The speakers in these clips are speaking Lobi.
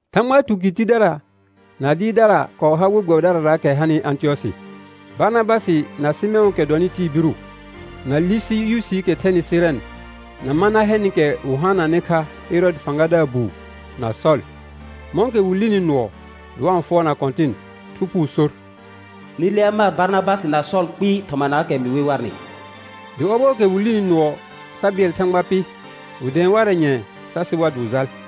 Thãgba tukɩr tidara na dɩɩrdara kɔɔ har we gbɛbɩdararaakɛ hanɩ Ãtɩyɔsɩ; Barnabasɩ na Sɩmɛ̃ʋʋkɛ dɔnɩ tɩɩ biru, na Lusiyusiikɛ thɛnɩ Sɩrɛn, na Manahɛnɩkɛ wɩ haananɩ kha Ɛrɔɔdɩ fãgadaar buu, na Sɔl. Mɔ̃kɛ wɩ lini nʋɔ dɩ wa-n fʋɔrna Kɔ̃tɩn, Thu Phuu sor: Nɩ lea mar Barnabasɩ na Sɔl kpɩɩ thɔmanaakɛ mɩ we warnɩ. Dɩ ɔbɔɔkɛ wɩ lini nʋɔ sa bɩɛl Thãgba pɩ, wɩ dɛ̃ɛ warɛ nyɛ̃ɛ sa sɩ war dɩ wɩ jal.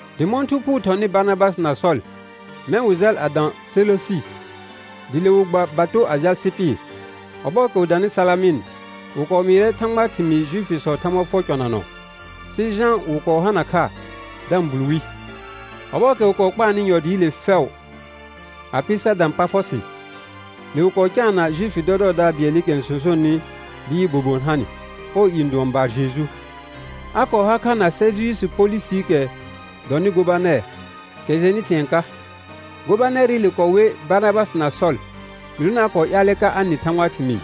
Dɩ mɔ̃ Thu Phuu thɔnɩ Barnabasɩ na Sɔl, mɛ̃ wɩ jal a dã Seləsɩ, dɩ le wɩ gba bato a jal Sɩpɩr. Ɔbɔɔkɛ wɩ danɩ Salamɩn, wɩ kɔɔ mɩɩrɛ Thãgbaa thɩmɩɩ Juifisɔɔ Thãgba fʋɔr cɔnanɔ; sɩ Jã wɩ kɔɔ hana kha da-n bul wi. Ɔbɔɔkɛ wɩ kɔɔ kpaarnɩ yɔ dɩɩle fɛʋ a pɩ sa dã Pafɔsɩ, le wɩ kɔɔ caana Juifi dɔdɔɔdaar bɩɛlɩkɛ n sõsonenɩ dɩ yɩ bobon ha nɩ. Ɔɔ i n dʋɔn Barjeju; a kɔɔ har kha na Sɛrjiyusi Polusiikɛ dɔnɩ gobanɛr, kɛ jɩɛnnɩ thɩ̃ɛ ka. Gobanɛrɩle kɔɔ wer Barnabasɩ na Sɔl, gɩdonɩ a kɔɔ ƴaalɛ ka a nɩ Thãgbaa thɩmɩɩ.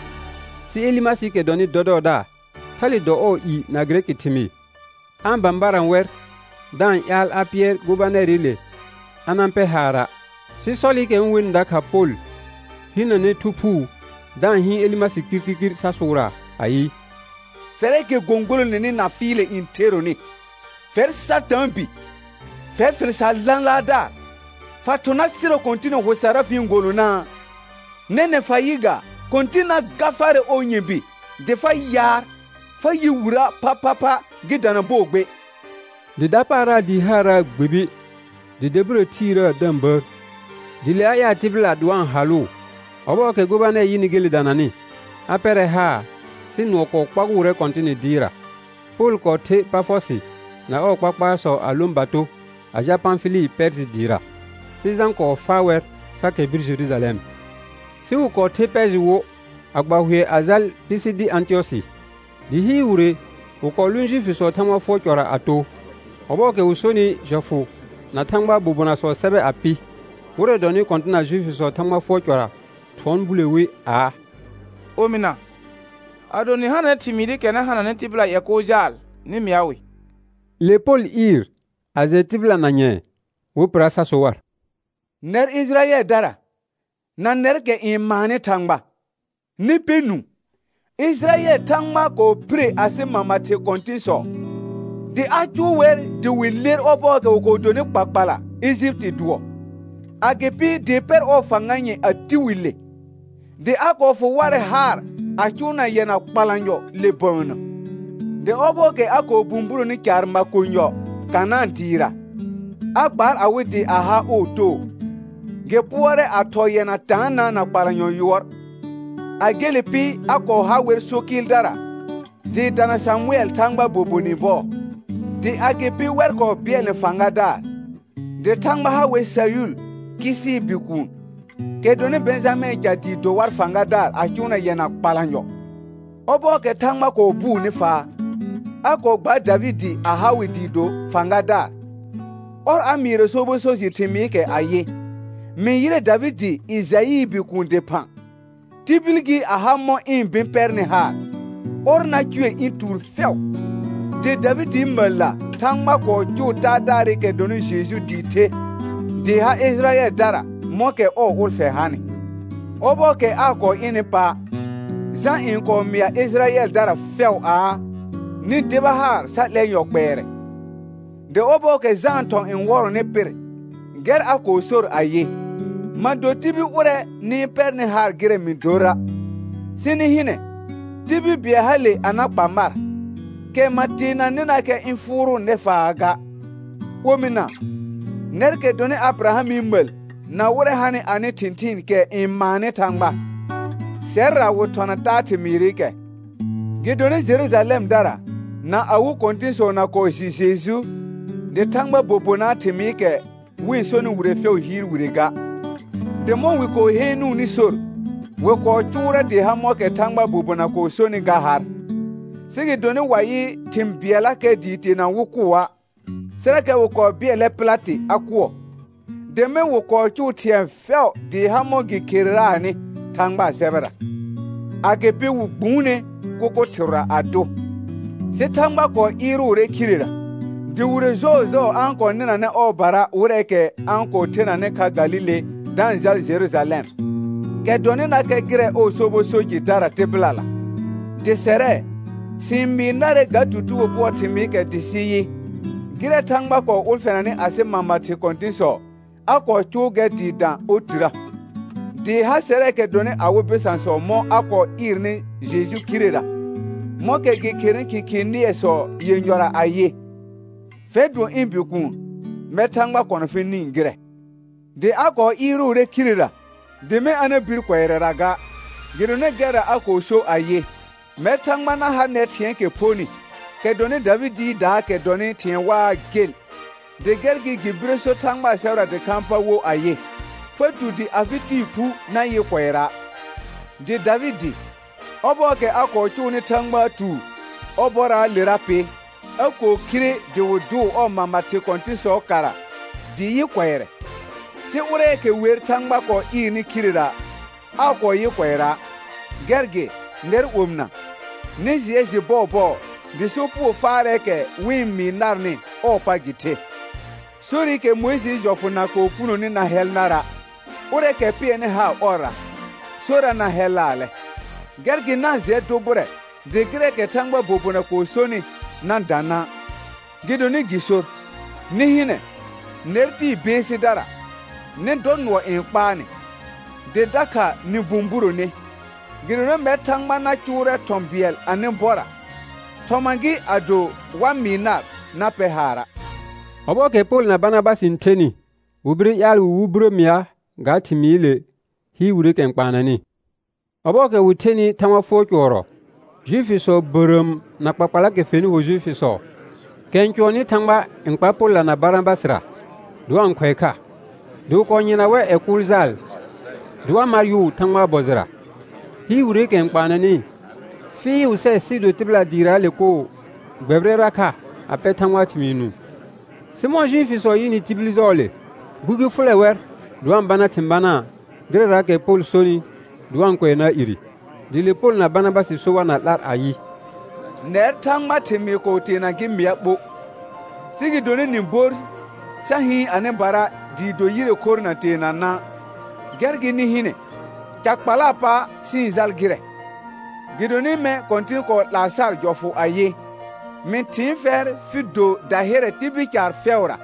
Sɩ Elɩmasɩɩkɛ dɔnɩ dɔdɔɔdaar, thale dɔ ɔɔ i na gɩrɛkɩ thɩmɩɩr, a-n bãbarã wɛr da-n ƴaal a pɩɛr gobanɛrɩle a na-n pɛ haara'. Sɩ Sɔlɩkɛ wɩ-n wenɩ dakha Pol hinəne Thu Phuu da-n hɩɩn Elɩmasɩ kirkirkir sa sʋʋraa ayɩ: Fɛrɛɛkɛ gõgolone na fɩɩlɛ n theronɩ, fɛr Satãa bi, fɛr fɩl sar lãlaardaar, fa thʋ̃ na sɩrɔ Kɔ̃tɩnɩ hʋ sarra fɩ-n golonaa? Nɛnɛ̃ fa yɩ gaa, Kɔ̃tɩn na ga farɛ ɔɔ nyɔ̃bi dɩ fa yaar, fa yɩ wirə' phaphapha gɩ dana bɔɔ gbe. Dɩ dapaara dɩɩ haaraa gbibi dɩ dabirə thiirəə da-n bəər, dɩ le a ƴaal tɩbɩla dɩ wa-n halʋʋ. Ɔbɔɔkɛ gobanɛr yɩnɩ gele dananɩ, a pɛrɛ haar sɩ nʋɔ kɔɔ kpagʋʋrɛ Kɔ̃tɩnɩ dɩɩra. Pol kɔɔ ther Pafɔsɩ na ɔɔ kpakpaarsɔ a lõ bato a jal Pãfɩlɩ Pɛɛrjɩ dɩɩra. Sɩ Jã kɔɔ faa wɛr sa kɛr bir Jerujalɛm. Sɩ wɩ kɔɔ ther Pɛɛrjɩ wo a gba hʋɛ a jal Pisidi Ãtɩyɔsɩ. Dɩ hɩɩr wire wɩ kɔɔ lʋʋn Juifisɔɔ Thãgba fʋɔr cɔra a too. Ɔbɔɔkɛ wɩ sonɩ jɔfʋ na Thãgbaa bobonasɔɔ sɛbɛ a pɩ, wɩrɛ dɔnɩ kɔ̃tɩna Juifisɔɔ Thãgba fʋɔr cɔra thʋɔn bule wi aa: Omɩna, ado nɩ hananɛ thɩmɩɩrɩkɛ na hananɩ tɩbɩla ƴɛ kʋʋl jaal, nɩ mɩa wɩ. Le Pol ɩɩr a jɛ tibɩla na nyɛ̃ɛ wɩ pɩra sa so war: Nɛr Ɩjɩrayɛldara, na nɛrkɛ n maannɩ Thãgba, nɩ pɛ nũu. Ɩjɩrayɛl Thãgba kɔɔ phire asɩ mama thɩ kɔ̃tɩ̃sɔ, dɩ a cʋʋ wɛr dɩ wɩ ler ɔbɔɔkɛ wɩ kɔɔ donɩ kpakpala Ejipiti dʋɔ, agɩpɩ dɩ pɛr ɔɔ fãga nyɛ̃ a ti wi le. Dɩ a kɔɔ fʋ warɛ haar a cʋʋna yɛna kpalanyɔ le bəənnə, dɩ ɔbɔɔkɛ a kɔɔ bũburoni caar makonyɔ Kanãa dɩɩra, a gbaar awɩ dɩ a ha ɔɔ too. Gɩ pʋɔrɛ a thɔɔ yɛna taanã na kpalanyɔ yʋɔr. A gele pɩ, a kɔɔ ha wɛr so kɩɩldara dɩɩ dana Samʋɛl Thãgbaa bobonɩ bɔɔ. Dɩ agɩpɩ wɛr kɔɔ bɩɛlnɛ fãgadaar. Dɩ Thãgba ha wɛr Sayʋl, Kɩsɩɩ bikuun, kɛ dɔnɩ Bɛ̃jamɛ̃ɛ ca dɩ do war fãgadaar a cʋʋna yɛna kpalanyɔ. Ɔbɔɔkɛ Thãgba kɔɔ bʋʋnɩ faa, a kɔɔ gbaar Davɩdɩ a ha wɩ dɩ do fãgadaar. Ɔr a mɩɩrɔ sobɔ so jɩ thɩmɩɩrɩkɛ ayɩ: «Mɩ yɩrɛ Davɩdɩ Ɩjaɩɩ bikuun dɩphã, tibil gɩ a ha mɔ̃ ɩ̃ bɩ̃ pɛrnɩ haar, ɔr na cʋɛ ɩ̃ tuur fɛʋ.» Dɩ Davɩdɩɩ məlla Thãgba kɔɔ cʋʋ Taadaarɩkɛ dɔnɩ Jeju dɩ the, dɩ ha Ɩjɩrayɛldara mɔ̃kɛ ɔɔ ʋlfɛ hanɩ. Ɔbɔɔkɛ aa kɔɔ ɩnɩ pa', Jã n kɔɔ mɩa Ɩjɩrayɛldarara fɛʋ aa: Nɩ deba haar sa 'lɛ yɔ kpɛɛrɛ. Dɩ ɔbɔɔkɛ Jãa thɔ̃ n wɔrɔnɩ pɩr, gɛr a kɔɔ sor ayɩ: Ma do tibil ʋrɛ nɩ-n pɛrnɩ haar gɩrɛ mɩ dora', sɩ nɩ hɩnɛ, tibil bɩɛl hale a na kpa mar, kɛ ma teenanɩnakɛ ɩ̃ fʋʋrʋʋ nɛfaa ga. Omɩna, nɛrkɛ dɔnɩ Abɩrahamɩ məl na wɩrɛ hanɩ anɩ thɩ̃thɩɩn kɛ n maannɩ Thãgba, sɛrra wɩ thɔna taa thɩmɩɩrɩkɛ. Gɩdonɩ Jerujalɛmdara na awɩ kɔ̃tɩ̃sɔ na kɔɔ jɩ Jeju, dɩ Thãgbaa bobonaa thɩmɩɩkɛ wɩ-n sonɩ wire fɛʋ hɩɩr wire ga, dɩ mɔ̃ wɩ kɔɔ heenuuni sor, wɩ kɔɔ cʋʋrɛ dɩɩ ha mɔ̃kɛ Thãgbaa bobona kɔɔ sonɩ ga har. Sɩ gɩdonɩ wa yɩ thɩ̃ bɩɛllakɛ dɩɩ teena wɩ kʋa', sɩrakɛ wɩ kɔɔ bɩɛlɛ Pɩlatɩ a kʋɔ. Dɩ mɛ̃ wɩ kɔɔ cʋʋ thɩ̃ɛ fɛʋ dɩɩ ha mɔ̃ gɩ khereraanɩ Thãgbaa sɛbɛra, agɩpɩ wɩ gbuune kʋkʋ thɩrʋra a dʋ. Sɩ Thãgba kɔɔ ɩɩrʋʋrɛ khirera. Dɩ wire jɔɔjɔɔ a-n kɔɔ nɩnanɛ ɔɔbara wɩrɛɛkɛ a-n kɔɔ thenanɩ kha Galile da-n jal Jerujalɛm, kɛ dɔnɩnakɛ gɩrɛ ɔɔ sobɔ so jɩdara tɩbɩlala. Dɩ sɛrɛ, sɩ-n mɩɩ narɛ ga tutugo bʋɔɔ thɩmɩɩkɛ dɩ sɩ yɩ, gɩrɛ Thãgba kɔɔ ʋlfɛnanɩ asɩ mama thɩ kɔ̃tɩ̃sɔ, a kɔɔ cʋʋ gɛr dɩɩ da otirə; dɩ ha sɛrɛɛkɛ dɔnɩ awɩ bɩsãsɔ mɔ̃ a kɔɔ ɩɩrnɩ Jeju khirera mɔ̃kɛ gɩ kherenɩ Khɩkhɩɩ nɩɛsɔ yenyɔra ayɩ: «Fɛr dʋɔn ɩ̃ Bikuun, mɛr Thãgba kɔna fɩ nĩ gɩrɛ.» Dɩ a kɔɔ ɩɩrʋʋrɛ khirera dɩ mɛ̃ a na bir kʋɛrɛra ga, gɩdonɩ gɛrra a kɔɔ so ayɩ: «Mɛr Thãgba na ha nɛr thɩ̃ɛɛkɛ phonɩ, kɛ dɔnɩ Davɩdɩɩdaakɛ dɔnɩ thɩ̃ɛ waa gel.» Dɩ gɛr gɩ gɩ bire so Thãgbaa sɛbɛra dɩkhãa pa wo ayɩ: «Fa tu dɩ afɩ Tɩɩ phu na yɩ kʋɛra'.» Dɩ Davɩdɩ, ɔbɔɔkɛ a kɔɔ cʋʋnɩ Thãgbaa tuur ɔɔ bɔraalera pɩ, a kɔɔ khire dɩ wɩ dʋʋ ɔɔ mama thɩ kɔ̃tɩ̃sɔɔ kara dɩ yɩ kʋɛrɛ. Sɩ ʋrɛɛkɛ wer Thãgba kɔɔ ɩɩrnɩ khirera, aa kɔɔ yɩ kʋɛra'. Gɛr gɩ, nɛr omɩna, nɩ jɩɛ jɩ bɔɔbɔɔ dɩ sopugo faarɛɛkɛ wɩ-n mɩɩ narnɩ ɔɔ pa gɩ the; sorɩkɛ Mʋɩjɩɩ jɔfʋ na kɔɔ punoni na hɛl nara', ʋrɛɛkɛ pɩɛrnɩ haar ɔrra, sorra na hɛlaalɛ. Gɛr gɩ na-n jɩɛ dʋ bʋrɛ dɩ gɩrɛɛkɛ Thãgbaa bobona kɔɔ sonɩ na dã na'. Gɩdonɩ gɩ sor: «Nɩ hɩnɛ, nɛr tɩɩ beesidara, nɩ dɔ nʋɔ n kpaa nɩ, dɩ dakha nɩ bũburone. Gɩdonɩ mɛr Thãgba na cʋʋrɛ thɔ̃ bɩɛl anɩ bɔra, thɔma gɩ ado wa mɩɩ nar na pɛr haara'.» Ɔbɔɔkɛ Pol na Barnabasɩ n thenɩ, wɩ bire ƴaal wɩ wɩ birə mɩa ga thɩmɩɩle hɩɩr wireekɛ n kpaanɛnɩ. Ɔbɔɔkɛ wɩ thenɩ Thãgba fʋɔr cʋɔrɔ, Juifisɔ bərəəm na kpakpalaakɛ fenɩ ho Juifisɔ, kɛ n cʋɔnnɩ Thãgba n kpar Polla na Barnabasɩra dɩ wa-n khʋɛ kha, dɩ wɩ kɔɔ yɩrna wɛr ƴɛ kʋʋl jaal dɩ wa mar yʋʋ Thãgbaa bɔ jɩra. Hɩɩr wireekɛ n kpaanɛnɩ, fɩɩʋ sɛ sɩɩ do tɩbɩla dɩɩraale koo gbɛbɩrɛra kha a pɛ Thãgbaa thɩmɩɩ nũu. Sɩ mɔ̃ Juifisɔ yɩnɩ tibil jɔɔle, gbugi fʋlɛ wɛr dɩ wa-n bana thɩ̃ banaa gɩrɛraakɛ Pol sonɩ dɩ wa-n kʋɛnaa ire. Dɩ le Pol na Barnabasɩ so war na 'lar ayɩ: Nɛr Thãgbaa thɩmɩɩ kɔɔ teena gɩ mɩa ɓo, sɩ gɩdonɩ nɩ bor sa hɩɩn anɩbara dɩɩ do yire khorr na teena na', gɛr gɩ nɩ hɩnɛ, ca kpalaa pa sɩ-n jal gɩrɛ. Gɩdonɩ mɛ̃ Kɔ̃tɩn kɔɔ 'laa sar jɔfʋ ayɩ: «Mɩ thɩɩn fɛr fɩ do dahɩrɛ tibil caar fɛʋra,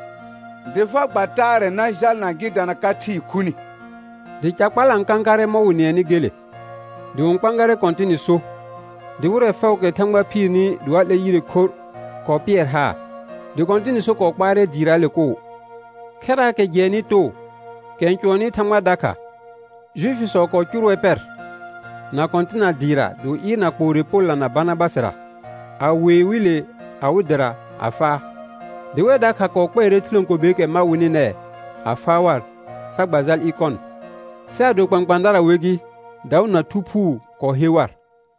dɩ fa gba taarɛ na jalna gɩ dana ka thɩɩ khuni.» Dɩ ca kpala n kãkarɛ mɔ̃ wɩ nɩɛnɩ gele. Dɩ wɩ-n kpãgarɛ Kɔ̃tɩnɩ so, dɩ wɩrɛ fɛʋʋkɛ Thãgba phiirni dɩ wa 'lɛ yire khorr kɔɔ pɩɛr haar. Dɩ Kɔ̃tɩnɩ so kɔɔ kpaarɛ dɩɩraale koo. Khɛraakɛ jɩɛnnɩ too, kɛ n cʋɔnnɩ Thãgba dakha, Juifisɔ kɔɔ cʋr wɛr pɛr na kɔ̃tɩna dɩɩra dɩ wɩ ɩɩrna kpoore Polla na Barnabasɩra, a wee wɩ le ɩwɩ dɩra a faa. Dɩ wɛr dakha kɔɔ kpɛɛrɛ thɩlãkobeekɛ ma wɩnɩ nɛɛ a faa war, sa gba jal Ɩkɔn. Sɩ ado kpãkpãadara wer gɩ, daʋ na Thu Phuu kɔɔ he war.